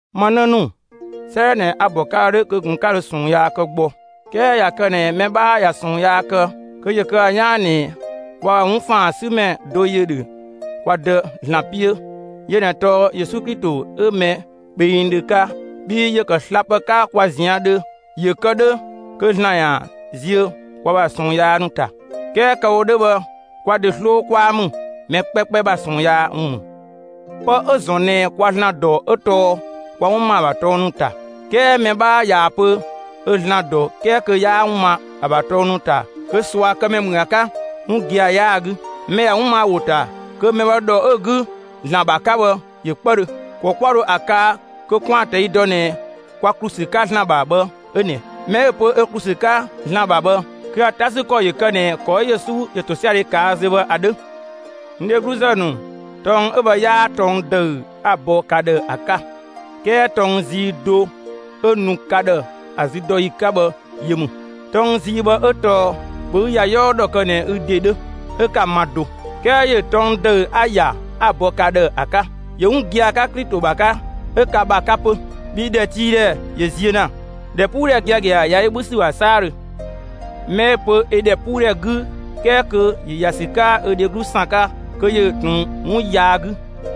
Ma 'në ‑nu, 'sëëdhɛ ꞊nɛ a‑ bɔ ka ‑dhë 'dhö kö ꞊kun 'ö 'ka dho ꞊sɔɔn yaa kë gbɔ. 'Kɛɛ ꞊ya kë ꞊nɛ mɛ 'bhaa ꞊ya ꞊sɔɔn yaa kë, kö ‑yö kë ‑a 'yaan ꞊nɛ kwa ‑bha 'wun ‑faan 'sü ‑mɛ do ‑yö ‑dhö kwa Dë ‑Zlan 'piö; yö ꞊nɛ tɔɔ Yesu Klito, 'ö mɛ kpengdhö 'ka. Bhii ‑yö ‑kë slapë 'ka kwa ꞊zian' dhö ‑yö kë 'dhö kö ‑Zlan ‑yaan ziö kwa ‑bha ꞊sɔɔn yaa ‑nu ‑ta. 'Kɛɛ kë‑ wo 'dhö bhë kwa ‑de 'sloo 'kwaa ‑mü, mɛ 'kpɛkpɛ ‑bha ꞊sɔɔn yaa ‑wun ‑mü. Pë 'ö‑ ‑zɔn ꞊nɛ kwa ‑Zlan dɔ 'ö tɔɔ kwa 'wun ma ‑a ‑bha tɔng ‑nu ‑ta. 'Kɛɛ mɛ 'bhaa ꞊yaa‑ pö ö ‑Zlan ‑dɔ 'kɛɛ kö 'yaa 'wun ma ‑a ‑bha tɔng ‑nu ‑ta, kö ꞊suakëmɛ ‑mü ‑a 'ka; 'wun gia‑ 'yaa‑ 'gü. Mɛ ꞊ya 'wun ma ‑a ‑wo ‑ta kö mɛ bhë ‑dhɔ 'ö‑ 'gü ‑Zlan ‑bha 'ka bhë ‑yö 'kpëdhö. ‑Kɔ 'kwa dho ‑a kaa kö 'kwaan‑ ꞊tɛi' dɔ ꞊nɛ kwa ‑klu ‑sü 'ka ‑Zlan ‑bha bhë 'ö ꞊nɛ: Mɛ 'ö‑ pö 'ö ‑klu ‑sü 'ka ‑Zlan ‑bha bhë, kö ‑a 'ta ‑sü ‑kɔ ‑yö kë ꞊nɛ ‑kɔ 'ö Yesu ‑yö ‑tosiadhe ꞊kaa' zö bhë ‑a 'dhö. N dhegluzë ‑nu, tɔng 'ö bhë 'yaa tɔng ‑dëü 'a‑ bɔ ka ‑dhë ‑a 'ka, 'kɛɛ tɔng zii do 'ö nu ka ‑dhë ‑a züdɔyi 'ka bhë yö ‑mü. Tɔng zii bhë ('ö tɔɔ: ‑Bhö ü ‑ya 'yɔɔ ‑dhɔ kë ꞊nɛ ü ‑de 'dhö, 'ö) 'ka‑ ma do. 'Kɛɛ ‑yö tɔng ‑dëü 'a‑ ‑ya, 'a‑ bɔ ka ‑dhë ‑a 'ka; ‑yö 'wun gia‑ 'ka Klito ‑bha 'ka, 'ö ka ‑bha 'ka 'pö; bhii ‑dhɛtiidhɛ ‑yö ziö ‑na; ‑dhɛpuudhɛ giagia ꞊ya yö 'bhü ‑sü ‑bha 'saadhö. Mɛ 'ö‑ pö ö ‑dhɛpuudhɛ 'gü 'kɛɛ kö ‑yö ‑ya ‑sü 'ka ö dheglu ‑san 'ka, kö ‑yö ꞊tun 'wun yaa 'gü.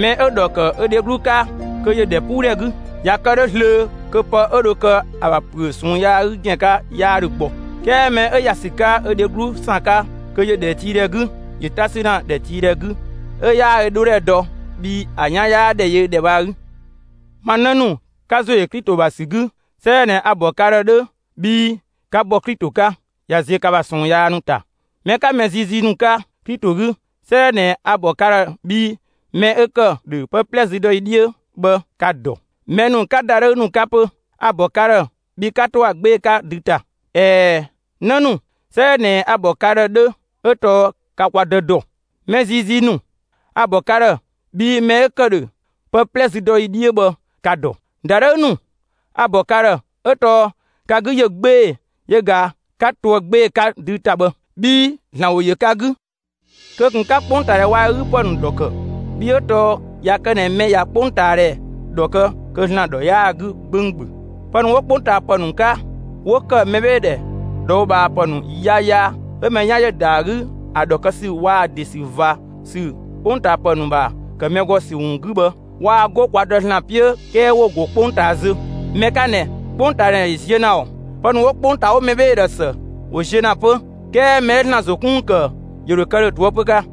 Mɛ 'ö‑ ‑dhɔ ‑kë ö dheglu 'ka, kö ‑yö ‑dhɛpuudhɛ 'gü; ꞊ya kë 'dhö zlöö kö pë 'ö dho kë ‑a ‑bha ‑püö ꞊sɔɔn yaa 'gü ‑gɛn 'ka 'yaa ‑dhö gbɔ. 'Kɛɛ mɛ 'ö ‑ya ‑sü 'ka ö dheglu ‑san 'ka kö ‑yö ‑dhɛtiidhɛ 'gü; ‑yö 'ta 'sü ‑na ‑dhɛtiidhɛ 'gü 'ö 'yaa ö 'dhodhɛ dɔ bhii ‑a 'yaa ‑dhɛ yö ‑dhɛ bhë ‑a 'gü. Ma 'në ‑nu, 'ka ‑zo ‑yö Klito ‑bha ‑sü 'gü, 'sëëdhɛ ꞊nɛ a‑ ‑bɔ ka ‑dhë 'dhö bhii 'ka bɔ Klito 'ka; ꞊ya ziö ka ‑bha ꞊sɔɔn yaa ‑nu ‑ta. Mɛ 'ka mɛ ziizii ‑nu 'ka Klito 'gü, 'sëëdhɛ ꞊nɛ a‑ ‑bɔ ka ‑dhë bhii mɛ 'ö ‑kë ‑dhö pë 'plɛ züdɔyi 'dhiö bhë, ka‑ ‑dɔ. Mɛ ‑nu 'ka ‑dadhëü ‑nu 'ka 'pö, a‑ ‑bɔ ka ‑dhë bhii 'ka 'to ‑a 'gbee‑ 'ka dü ‑ta. ꞊Ɛɛ, 'në ‑nu, 'sëëdhɛ ꞊nɛ a‑ ‑bɔ ka ‑dhë 'dhö 'ö tɔɔ ka kwa Dë ‑dɔ. Mɛ ziizii ‑nu, a‑ ‑bɔ ka ‑dhë bhii mɛ 'ö ‑kë ‑dhö pë 'plɛ züdɔyi 'dhiö bhë, ka‑ ‑dɔ. ‑Dadhëü ‑nu, a‑ ‑bɔ ka ‑dhë 'ö tɔɔ ka 'gü ‑yö 'gbee‑, yö ꞊ga 'ka toë‑ 'gbee‑ 'ka dü ‑ta bhë; bhii ‑Zlan ‑wo ‑yö ka 'gü. Kö ꞊kun 'ka 'kpongtaadhɛ waa‑ ö 'gü ‑pë ‑nu ‑dhɔ ‑kë! Bhii 'ö tɔɔ ꞊ya kë ꞊nɛ mɛ ꞊ya 'kpongtaadhɛ ‑dhɔ kë kö ‑Zlan ‑dhɔ 'yaa‑ 'gü 'gbönggböng. Pë ‑nu 'wo 'kpongtaapë ‑nu 'ka, 'wo ‑kë mɛbheedhe ꞊dhɔɔbhaapë ‑nu yaya, 'ö mɛ 'yan ‑yö ‑da ‑a 'gü ‑a ‑dhɔ kë ‑sü waa‑ ‑de ‑sü ꞊va ‑sü 'kpongtaapë ‑nu ‑bha ‑kë mɛ ‑gɔ ‑sü ‑wun 'gü bhë, waa 'go kwa Dë (‑Zlan) 'piö, 'kɛɛ ‑wo ‑go 'kpongtaa zö. Mɛ 'ka ꞊nɛ, 'kpongtaadhɛ ‑yö ziö ‑na ‑ɔɔ. Pë ‑nu 'wo 'kpongtaa 'wo mɛbheedhe ‑dhë ‑së ‑wo ziö ‑na 'pö. 'Kɛɛ mɛ 'ö ‑Zlan ‑zo 'kun ‑wun ‑kë ‑yö ‑dho kë ‑dhö ꞊toëpö 'ka.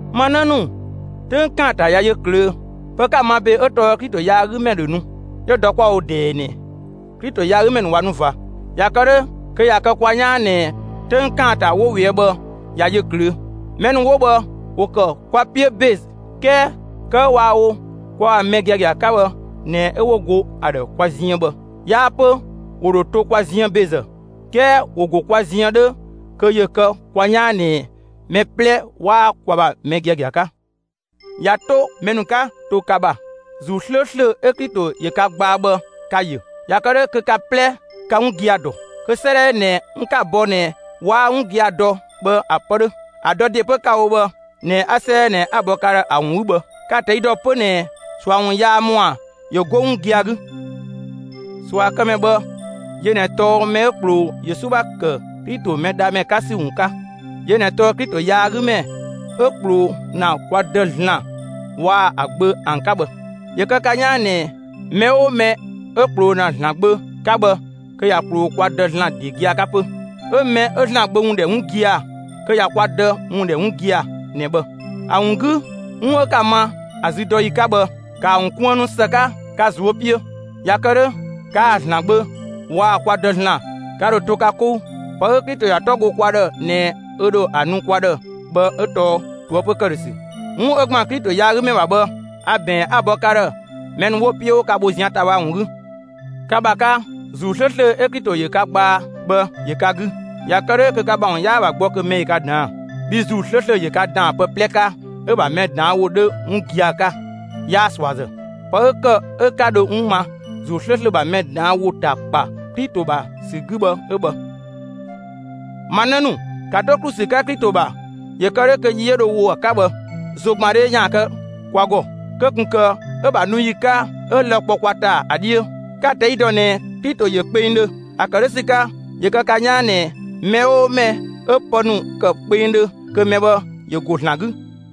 Ma 'në ‑nu, 'töng ‑kaanta ꞊ya yö ꞊klöö'! Pë 'ka‑ ma ‑be 'ö tɔɔ Klito yaagümɛ ‑dhö nu; 'yö dɔ 'kwa‑ wo ꞊dɛɛ ꞊nɛ Klito yaagümɛ ‑nu ꞊wa nu ꞊va; ꞊ya kë 'dhö, kö ꞊ya kë kwa 'yaan ꞊nɛ 'töng ‑kaanta 'wo ꞊weë' bhë ꞊ya yö ꞊klöö'. Mɛ ‑nu 'wo bhë, ‑wo ‑kë kwa 'piö ‑be; 'kɛɛ kë 'ö waa‑ wo kwa ‑bha mɛ giagia 'ka bhë ꞊nɛ 'ö 'wo go ‑a ‑dhë kwa ziën bhë, 'yaa 'pö ‑wo ‑dho to kwa ziën ‑bezë; 'kɛɛ ‑wo ‑go kwa ziën 'dhö kö ‑yö kë kwa 'yaan ꞊nɛ mɛ 'plɛ 'waa kwa ‑bha mɛ giagia 'ka. ꞊Ya 'to mɛ ‑nu 'ka to ka ‑bha, ‑Zuu 'slööslö 'ö Klito ‑yö ka gbaa bhë 'ka‑ yö. ꞊Ya kë 'dhö kö ka 'plɛ 'ka 'wun gia‑ dɔ. Kö 'sëëdhɛ 'ö ꞊nɛ, n 'ka‑ bɔ ꞊nɛ 'waa 'wun gia‑ dɔ bhë ‑a ‑pë 'dhö. ‑A dɔ ‑de 'pö 'ka‑ wo bhë ꞊nɛ 'ö 'sëëdhɛ ꞊nɛ 'a‑ bɔ ka ‑dhë ‑a ‑wun 'gü bhë. Ka‑ ꞊tɛi' ‑dɔ 'pö ꞊nɛ ꞊sua ‑wun yaa ‑mɔa ‑yö 'go 'wun gia‑ 'gü. ꞊Suakëmɛ bhë, yö ꞊nɛ tɔɔ mɛ 'ö ꞊kploo Yesu ‑bha ‑kë Klito Mɛdhamɛ 'ka ‑sü ‑wun 'ka; yö ꞊nɛ tɔɔ Klito yaagümɛ 'ö ꞊kploo ‑na kwa Dë (‑Zlan) waa‑ ‑a Gbö ‑an 'ka bhë. ‑Yö kë ka 'yaan ꞊nɛ, mɛ 'oo mɛ 'ö ꞊kploo ‑na ‑Zlan Gbö 'ka bhë kö ꞊ya ꞊kploo kwa Dë ‑Zlan ‑de gia‑ 'ka 'pö. 'Ö mɛ 'ö ‑Zlan Gbö ‑wun ‑dhɛ 'wun gia‑ kö ꞊ya kwa Dë ‑wun ‑dhɛ 'wun gia‑ ꞊nɛ bhë. ‑A ‑wun 'gü, 'wun 'ö 'ka‑ ma ‑a züdɔyi 'ka bhë, ‑kaa ‑wun kuënnu ‑së 'ka ka ꞊zuö' 'piö; ꞊ya kë 'dhö kaa‑ ‑Zlan Gbö waa‑ kwa Dë (‑Zlan) ka ‑dho to ka 'kou. Pë 'ö Klito ‑ya 'tɔ go kwa ‑dhë ꞊nɛ ö ‑dhö ‑a nu kwa ‑dhë bhë 'ö tɔɔ ꞊toëpö ‑këdhösü. 'Wun 'ö ‑gban Klito yaagümɛ ‑bha bhë, a‑ ‑bɛɛn, 'a‑ bɔ ka ‑dhë mɛ ‑nu 'wo‑ 'piö 'wo ka bho zian ‑ta bhë ‑an ‑wun 'gü. Ka ‑bha 'ka, ‑Zuu 'slööslö 'ö Klito ‑yö ka gbaa bhë ‑yö ka 'gü. ꞊Ya kë 'dhö kö ka ‑bha ‑wun 'yaa‑ ‑bha gbɔ kö mɛ ‑yö ka ‑daan. Bhii ‑Zuu 'slööslö ‑yö ka ‑daan pë 'plɛ 'ka 'ö‑ ‑bha mɛ ꞊daan' ‑wo 'dhö 'wun gia‑ 'ka, 'yaa ꞊suazë. Pë 'ö ‑kë 'ö 'ka dho 'wun ma ‑Zuu ('slööslö) ‑bha mɛ ꞊daan' ‑wo ‑ta ‑kpa Klito ‑bha ‑sü 'gü bhë 'ö bhë. Ma 'në ‑nu, ‑ka 'to ‑klu ‑sü 'ka Klito ‑bha ‑yö kë 'dhö kö yi 'ö dho ‑wo ‑a 'ka bhë, ‑zogbandhe ‑yaan kë kwa ‑gɔ, kö ꞊kun ‑kë 'ö‑ ‑bha nu ‑yi 'ka, 'ö lë‑ kpɔ kwa ‑ta ‑a 'dhiö. Ka‑ ꞊tɛi' ‑dɔ ꞊nɛ Klito ‑yö kpengdhö. ‑A ‑kë 'dhö ‑sü 'ka, ‑yö kë ka 'yaan ꞊nɛ mɛ 'oo mɛ 'ö pë ‑nu ‑kë kpengdhö kö mɛ bhë ‑yö ‑go ‑Zlan 'gü.